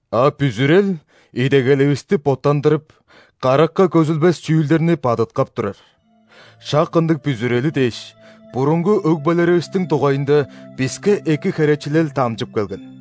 А бүзүрел идегеливисти боттандырып, каракка көзүлбес чүүлдерни бадыткап турар. Шак ындыг бүзүрели дээш, бурунгу өгбелеривистиң дугайында биске эки херечилел дамчып келген.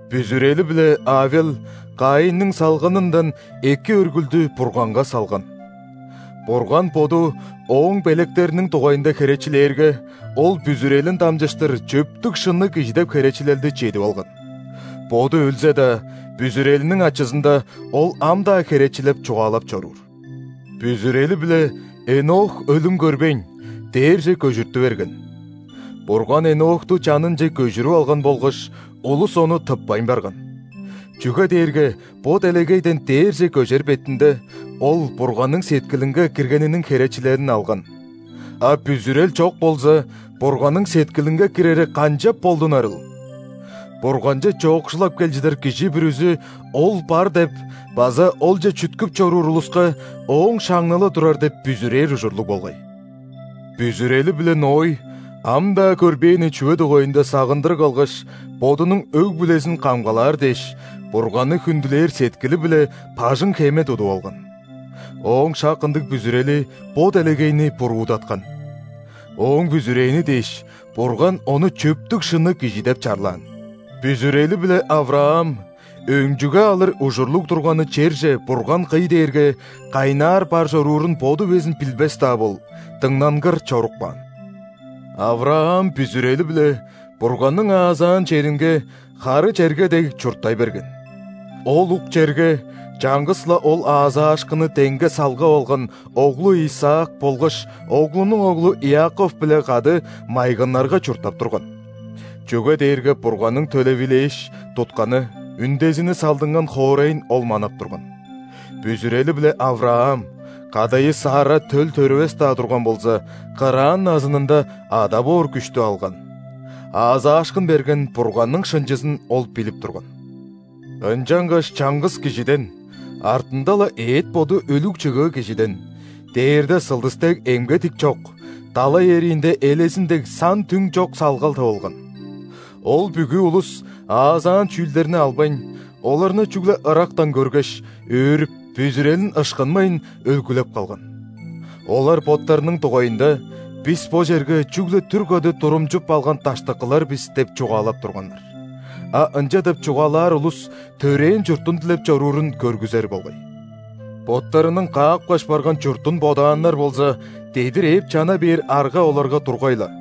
Бүзүрели-биле Авел Каинниң салганындан эки өргүлдү Бурганга салган. Бурган Боду ооң белектериниң дугайында херечилээрге, ол бүзүрелин дамчыштыр чөптүг-шынныг кижи деп херечилелди чедип алган. Боду өлзе-даа, бүзүрелиниң ачызында, ол ам-даа херечилеп чугаалап чоруур. Бүзүрели-биле Энох өлүм көрбейн, дээрже көжүртү берген. Бурган Энохту чанынче көжүрүп алган болгаш, улус ону тыппайн барган. Чүге дээрге бо делегейден дээрже көжер бетинде, ол Бурганның сеткилинге киргениниң херечилелин алган. А бүзүрел чок болза, Бурганның сеткилинге кирери канчап болдунарыл? Бурганче чоокшулап кел чыдар кижи бүрүзү Ол бар деп база Олче чүткүп чоруур улуска Ооң шаңналы турар деп бүзүрээр ужурлуг болгай. Бүзүрели-биле Ной ам-даа көрбээни чүве дугайында сагындырыг алгаш, бодунуң өг-бүлезин камгалаар дээш, Бурганны хүндүлээр сеткили-биле бажың-хеме тудуп алган. Ооң шак ындыг бүзүрели бо делегейни буруудаткан. Ооң бүзүрээни дээш, Бурган ону чөптүг-шынныг кижи деп чарлаан. Бүзүрели-биле Авраам, өнчүге алыр ужурлуг турганы черже Бурган кый дээрге, кайнаар бар чоруурун боду безин билбес-даа бол, дыңнангыр чоруп каан. Авраам бүзүрели-биле Бурганның аазаан черинге, хары черге дег, чурттай берген. Ол ук черге чаңгыс-ла ол аазаашкынны деңге салгап алган оглу Исаак болгаш оглунуң оглу Иаков-биле кады майгыннарга чурттап турган. Чүге дээрге Бурганның төлевилээш, тутканы, үндезини салдынган хоорайын ол манап турган. Бүзүрели-биле Авраам (кадайы Сарра төл төрүвес-даа турган болза) кыраан назынында ада боор күштү алган. Аазаашкын берген Бурганның шынчызын ол билип турган. Ынчангаш чаңгыс кижиден (артында-ла эът-боду өлүг чыгыы кижиден) дээрде сылдыс дег эмге-тикчок, далай эриинде элезин дег сан-түң чок салгал тывылган. Ол бүгү улус аазаан чүүлдерни албайн, оларны чүгле ырактан көргеш, өөрүп, бүзүрелин ышкынмайн, өлгүлеп калган. Олар боттарының дугайында: «Бис бо черге чүгле түр када турумчуп алган даштыкылар бис» – деп чугаалап турганнар. А ынча деп чугаалаар улус төрээн чуртун дилеп чоруурун көргүзер болгай. Боттарының каапкаш барган чуртун бодааннар болза, дедир ээп чана бээр арга оларга тургай-ла.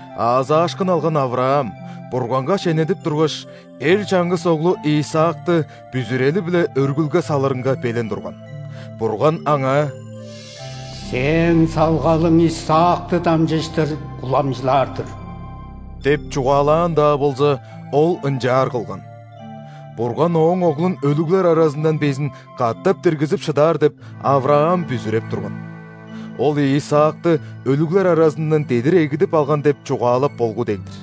Аазаашкын алган Авраам, Бурганга шенедип тургаш, эр чаңгыс оглу Исаакты бүзүрели-биле өргүлге салырынга белен турган. Бурган аңаа: «Сээң салгалың Исаакты дамчыштыр уламчылаар-дыр» – деп чугаалаан-даа болза, ол ынчаар кылган. Бурган ооң оглун өлүглер аразындан безин катап диргизип шыдаар деп, Авраам бүзүреп турган. Ол Исаакты өлүглер аразындан дедир эгидип алган деп чугаалап болгу дег-дир.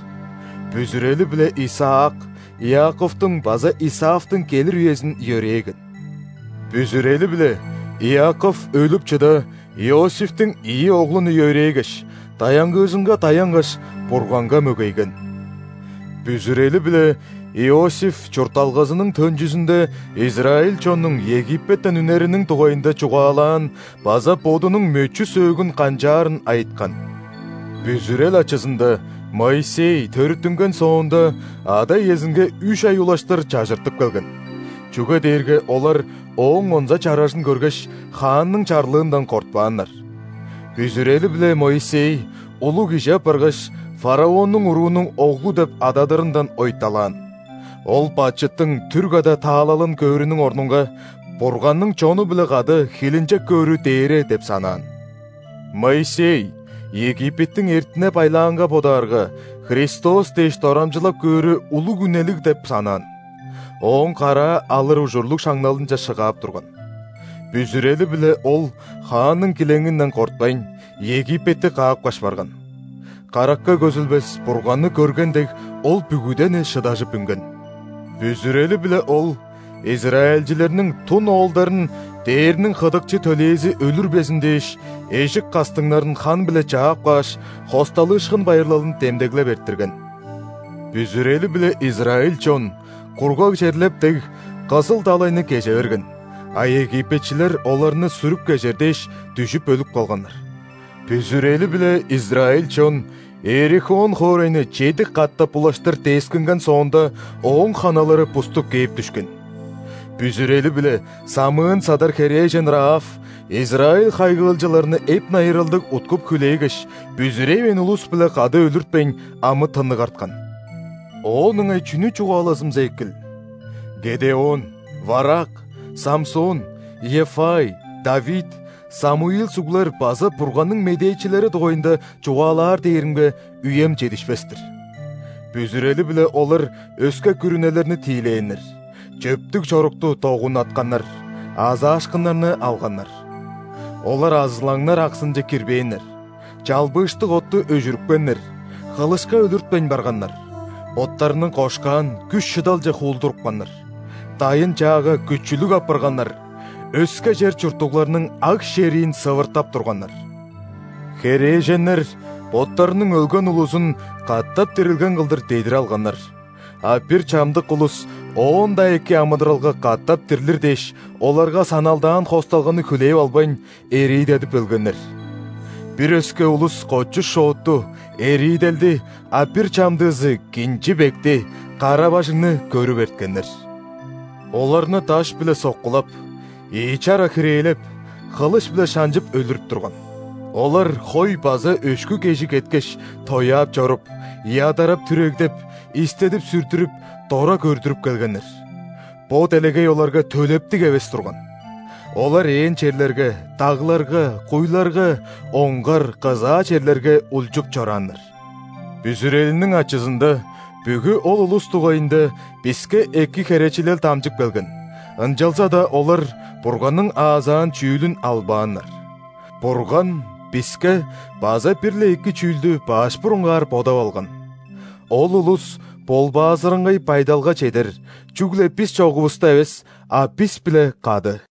Бүзүрели-биле Исаак Иаковтуң база Исавтың келир үезин йөрээген. Бүзүрели-биле Иаков, өлүп чыда, Иосифтиң ийи оглун йөрээгеш, даянгыыжынга даянгаш, Бурганга мөгейген. Бүзүрели-биле Иосиф чуртталгазының төнчүзүнде израиль чоннуң Египеттен үнериниң дугайында чугаалаан база бодунуң мөчү-сөөгүн канчаарын айыткан. Бүзүрел ачызында Моисей, төрүттүнген соонда, ада-иезинге үш ай улаштыр чажыртып келген, чүге дээрге олар ооң онза чаражын көргеш, хаанның чарлыындан кортпааннар. Бүзүрели-биле Моисей, улуг кижи апаргаш, фараоннуң уруунуң оглу деп ададырындан ойталаан. Ол бачыттың түр када таалалын көөрүнүң орнунга, Бурганның чону-биле кады хилинчек көөрү дээре деп санаан. Моисей Египеттиң эртине-байлаанга бодаарга, Христос дээш дорамчылал көөрү улуг үнелиг деп санаан, ооң караа алыр ужурлуг шаңналынче шыгаап турган. Бүзүрели-биле ол, хаанның килеңинден кортпайн, Египетти каапкаш барган. Каракка көзүлбес Бурганны көрген дег, ол бүгүдени шыдажып үнген. Бүзүрели-биле ол, израильчилерниң дун оолдарын дээрниң хыдыкчы төлээзи өлүрбезин дээш, эжик кастыңнарын хан-биле чаап кааш, ·Хосталыышкын байырлалын демдеглеп эрттирген. Бүзүрели-биле израиль чон, кургаг черлеп дег, Кызыл далайны кеже берген, а египетчилер оларны сүрүп кежер дээш, дүжүп өлүп калганнар. Бүзүрели-биле израиль чон Иерихон хоорайны чеди катап улаштыр дескинген соонда, ооң ханалары буступ кээп дүшкен. Бүзүрели-биле самыын-садар херээжен Раав, израиль хайгыылчыларны эп-найыралдыг уткуп-хүлээгеш, бүзүревээн улус-биле кады өлүртпейн, амы-тынныг арткан. Оон ыңай чүнү чугаалазымза экил? Гедеон, Варак, Самсон, Иеффай, Давид, Самуил суглар база Бурганның медээчилери дугайында чугаалаар дээримге, үем чедишпес-тир. Бүзүрели-биле олар өске күрүнелерни тиилээннер, чөптүг чорукту догуннатканнар, аазаашкыннарны алганнар. Олар арзылаңнар аксынче кирбээннер, чалбыыштыг отту өжүрүпкеннер, хылышка өлүртпейн барганнар, боттарының кошкаан күш-шыдалче хуулдурупканнар, дайын-чаага күчүлүг апарганнар, өске чер чурттугларның аг-шериин сывыртап турганнар. Херээженнер боттарының өлген улузун катап дирилген кылдыр дедир алганнар. А бир чамдык улус оон-даа эки амыдыралга катап дирлир дээш, оларга саналдаан хосталганы хүлээп албайн, эриидедип өлгеннер. Бир өске улус кочу-шоотту, эрииделди, а бир чамдыызы кинчи-бекти, кара-бажыңны көрүп эрткеннер. Оларны даш-биле соккулап, ийи чара хирээлеп, хылыш-биле шанчып өлүрүп турган. Олар хой база өшкү кежи кеткеш, тояап чоруп, ядарап-түрегдеп, истедип-сүрдүрүп, дора көрдүрүп келгеннер. (Бо делегей оларга төлептиг эвес турган!) Олар ээн черлерге, дагларга, куйларга, оңгар, кызаа черлерге улчуп чорааннар. Бүзүрелиниң ачызында бүгү ол улус дугайында биске эки херечилел дамчып келген, ынчалза-даа олар Бурганның аазаан чүүлүн албааннар. Бурган биске база бир-ле эки чүүлдү баш бурунгаар бодап алган: ол улус ·болбаазыраңгай байдалга чедер, чүгле бис чогувуста эвес, а бис-биле кады.